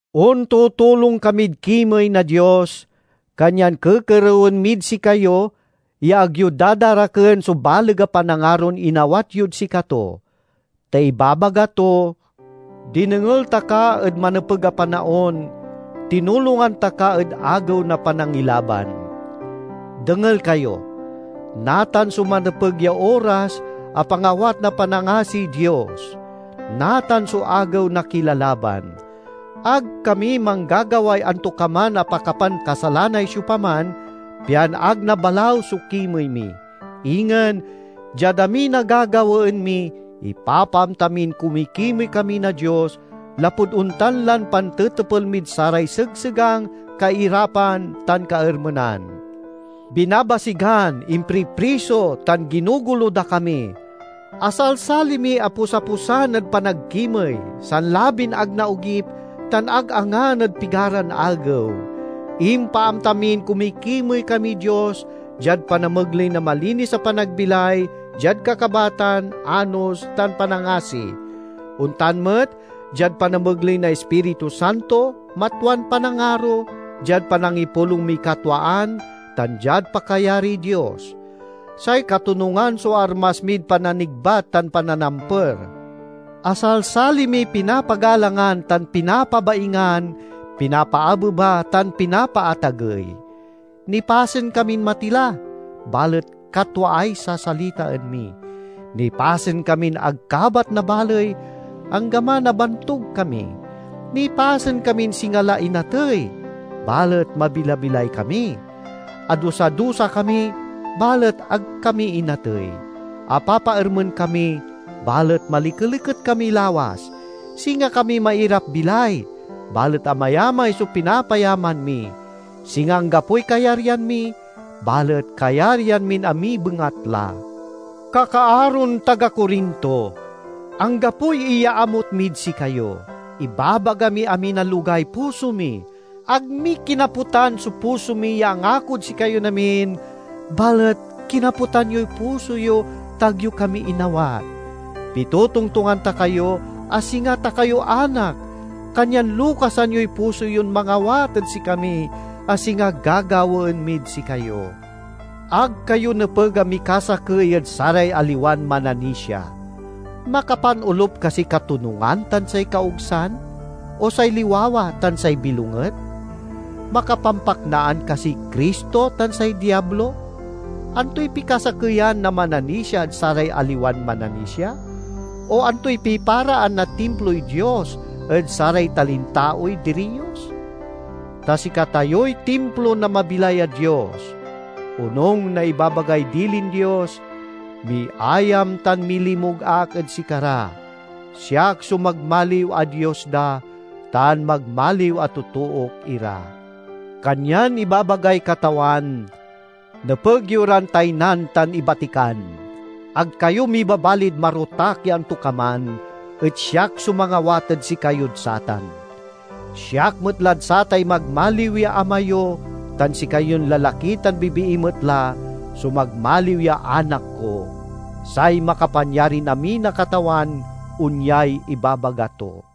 Ontutulong kamid kimey na Dios, kanyan kekerewen mid sikayo ya ag yo dadaraken so baleg a panangaron inawat yod sikato. Ta ibabaga to, "Dinengel ta ka ed manepeg a panaon, tinulongan ta ka ed agew na panangilaban." Dengel kayo! Natan so manepeg ya oras a pangawat na panangasiy Dios! Natan so agew na kilalaban! Ag kami manggagaway antokaman a pakapankasalanay siopaman, pian ag nabalaw so kimey mi. Ingen, diad amin a gagawaen mi, ipapaamta min kumikimey kami na Dios, lapud ontan lan pantetepel mid saray segsegang, kairapan, tan kaermenan. Binabasigan, impripriso, tan ginogolo da kami. Asalsali miy aposaposan ed panagkimey, sanlabin ag naogip, tan ag angan ed pigaran agew. Impaamta min kumikimey kamiy Dios diad panamegley na malinis a panagbilay, diad kakabatan, anos, tan panangasi; ontan met diad panamegley na Ispiritu Santo, matwan panangaro, diad panangipulong miy katwaan, tan diad pakayariy Dios. Say katonungan so armas mid pananigbat tan pananamper. Asalsali miy pinapagalangan tan pinapabaingan, pinapaabeba tan pinapaatagey. Nipasen kamin matila, balet katwaay sasalitaen mi. Nipasen kamin ag kabat na baley, anggaman a bantug kami; nipasen kamin singa la inatey, balet mabilabilay kami. Adusa-dusa kami, balet ag kami inatey; apapaermen kami, balet malikeliket kami lawas; singa kami mairap-bilay, balet amayamay so pinapayaman mi; singa anggapoy kayaryan mi, balet kayaryan min amiy bengatla. Kakaaron taga Corinto! Anggapoy iyaamut mid sikayo. Ibabaga miy amin a logay puso mi. Ag mi kinaputan so puso mi ya angakod sikayon amin, balet kinaputan yoy puso yo ta ag yo kami inawat. Pitotongtongan ta kayo a singa ta kayo anak, kanyan lokasan yoy puso yon mangawat ed sikami, a singa gagawaen mid sikayo. Ag kayo nepeg a mikasakey ed saray aliwan mananisia. Makapanolup kasiy katonungan tan say kaogsan? O say liwawa tan say bilonget? Makapampaknaan kasiy Cristo tan say Diablo? Antoy pikasakeyan na mananisia ed saray aliwan mananisia? O antoy piparaan na Timploy Dios ed saray talintaoy diriyos? Ta sikatayoy timplo na mabilay a Dios! Onung na ibabagay dilin Dios, "Miayam tan milimug ak ed sikara; siak so magmaliw a Dios da, tan magmaliw a totook ira." Kanyan ibabagay Katawan, "Nepeg yo ran taynan tan ibatikan. Ag kayo mibabalid marotak ya antokaman, et siak so mangawat ed sikayod satan. Siak met lad satay magmaliw ya ama yo, tan sikayon lalaki tan bibii met la so magmaliw ya anak ko, say Makapanyarin-amin a Katawan onyay ibabaga to."